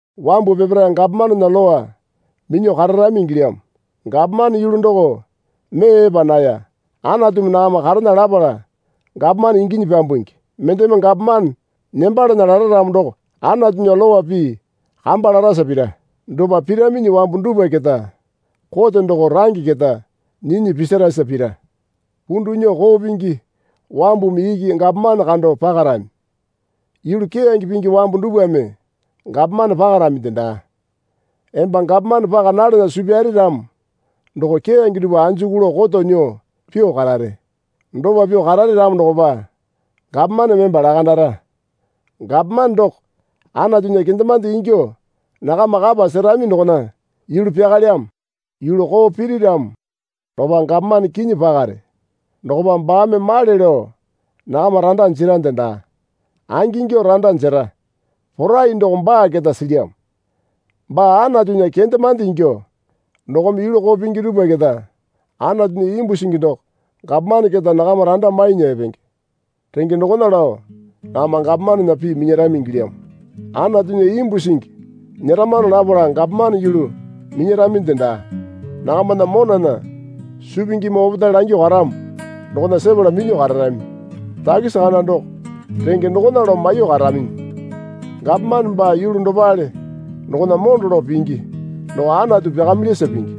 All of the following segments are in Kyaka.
Wambu peparae gapomanena lowa minyuo kararami ingilyamo. Gapomane yulu doko mee epa naya. Anatumi nakama karena lapala gapomane inginyi pyambungi. Mendeme gapomane nembalana lara ramo doko Anatunya lowa pii kamba larasa pira. Dopa piraminyi wambu dupwa keta kote doko range keta nyinyi pisarasa pira. Pundu nyuo koo pingi wambumi iki gapomane kando pakarami. Yulu keyange pingi wambu dupwame gapomane pakaraminde daa. Emba gapomane paka nalana suu pyare ramo doko keyange dupwa anjuku lao koto nyuo pyuo karare. Dopa pyuo karare ramo dokopa gapomaneme emba lakandara. Gapomane doko Anatunya kendemande ingyuo nakama kapa serami dokona yulu pyakalyamo. Yulu koo piri ramo dokopa gapomane kinyi pakare. Dokopa baame male lao nakama randa jerande daa. Angingyuo randa jera porai doko baa keta silyamo. Baa Anatunya kendemande ingyuo dokome yulu koo pingi dupwa keta Anatunya imbu singi doko gapomane keta nakama randa mainya epenge. Renge dokona lao nakama gapomanena pii minyarami ingilyamo. Anatunya imbu singi nyeramano lapala gapomane yulu minyaraminde daa. Nakamana monana suu pingimi opetae langyuo karamo dokona sepala minyuo kararami. Takisi kana doko renge dokona lao maiyuo karaminyi. Gapomane baa yulu dopale dokona mondo lao pingi doko Anatu pyakamilyasa pingi.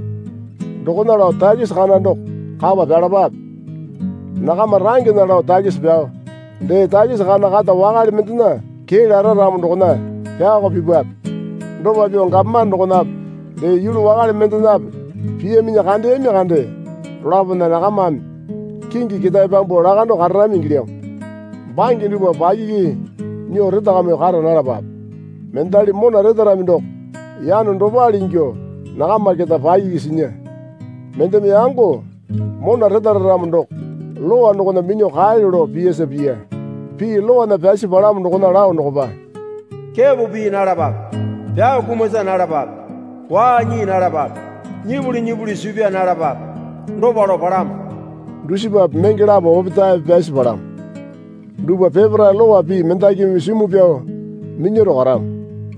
Dokona lao takisi kana doko kapa pyalapape. Nakama rangena lao takisi pyao dee takisi kana kata wakale mendena kee lara ramo dokona pyaoko pipape. Dopa pyuo gapomane dokonape dee yulu wakale mendenape piyaminyi kandeyami kande, dolapona nakamame kingi ketae pyambuo lakando kararami ingilyamo. Bange dupwa pakiki nyuo retakamyuo kara nalapape. Mendali mona retarami doko yano dopale ingyuo nakama keta pakiki sinya. Mendeme yango mona retaramo doko Lowa dokona minyuo kaelyo lao piyasa piya. Pii lowana pyasi palamo dokona lao dokopa, Kepo pii nalapape. Pyao kumasa nalapape. Waa nyii nalapape. Nyipuli nyipuli suu pyaa nalapape, dopa lao palamo. Dusipape menge lapo opetaepe pyasi palamo. Dupwa peparae lowa pii mendakimi simu pyao minyaro karamo.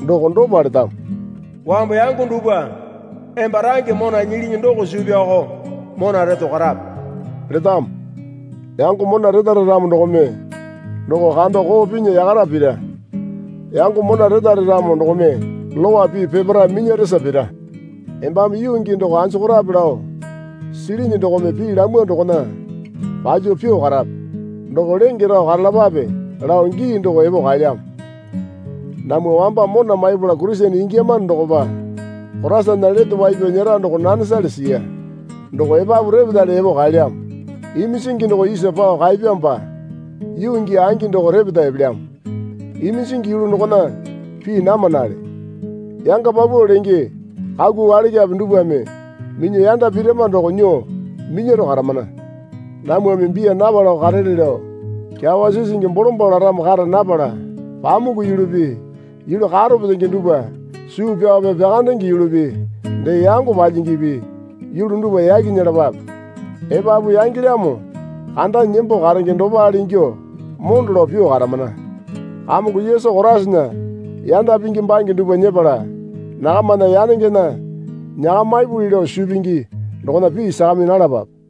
Doko dopa letamo. Wambu yango dupwa emba range mona nyilini doko suu pyaoko mona reto karape, letamo. Yango mona retara ramo dokome doko kando koo pinya yakara pira. Yango mona retare ramo dokome Lowa pii peparae minyaresa pira. Embame yuu gii doko anjokorape lao silini dokome pii lamwa dokona palyuo pyuo karape. Doko lenge rao karalapape lao gii doko epo kaelyamo. Namwa wamba mona maipala Kurisene ingiyama dokopa Koraisana lete wai pyao nyera doko nanesale siya. Doko epapu repetale epo kaelyamo. Iminjingi doko isa pao kaepyamopa yuu gii angi doko repeta epelyamo. Iminjingi yulu dokona pii namanale. Yanga paupau lenge kaku walakyape dupwame minyuo yanda pirama doko nyuo minyaro karamana. Namwame biya napalako karele lao kyawa sisingi bolombalo laramo kara napala pamuku yulupi yulu karo petenge dupwa suu pyaope pyakandenge yulupi dee yango palyingipi yulu dupwa yaki nyelapape. Epapu yangelyamo kandanyi nembo karenge dopale ingyuo mondo lao pyuo karamana. Kamongo Yesu Koraisana yanda pingi bange dupwa nyepala nakamana yanengena nyakamipuli lao suu pingi dokona pii sakami nalapape.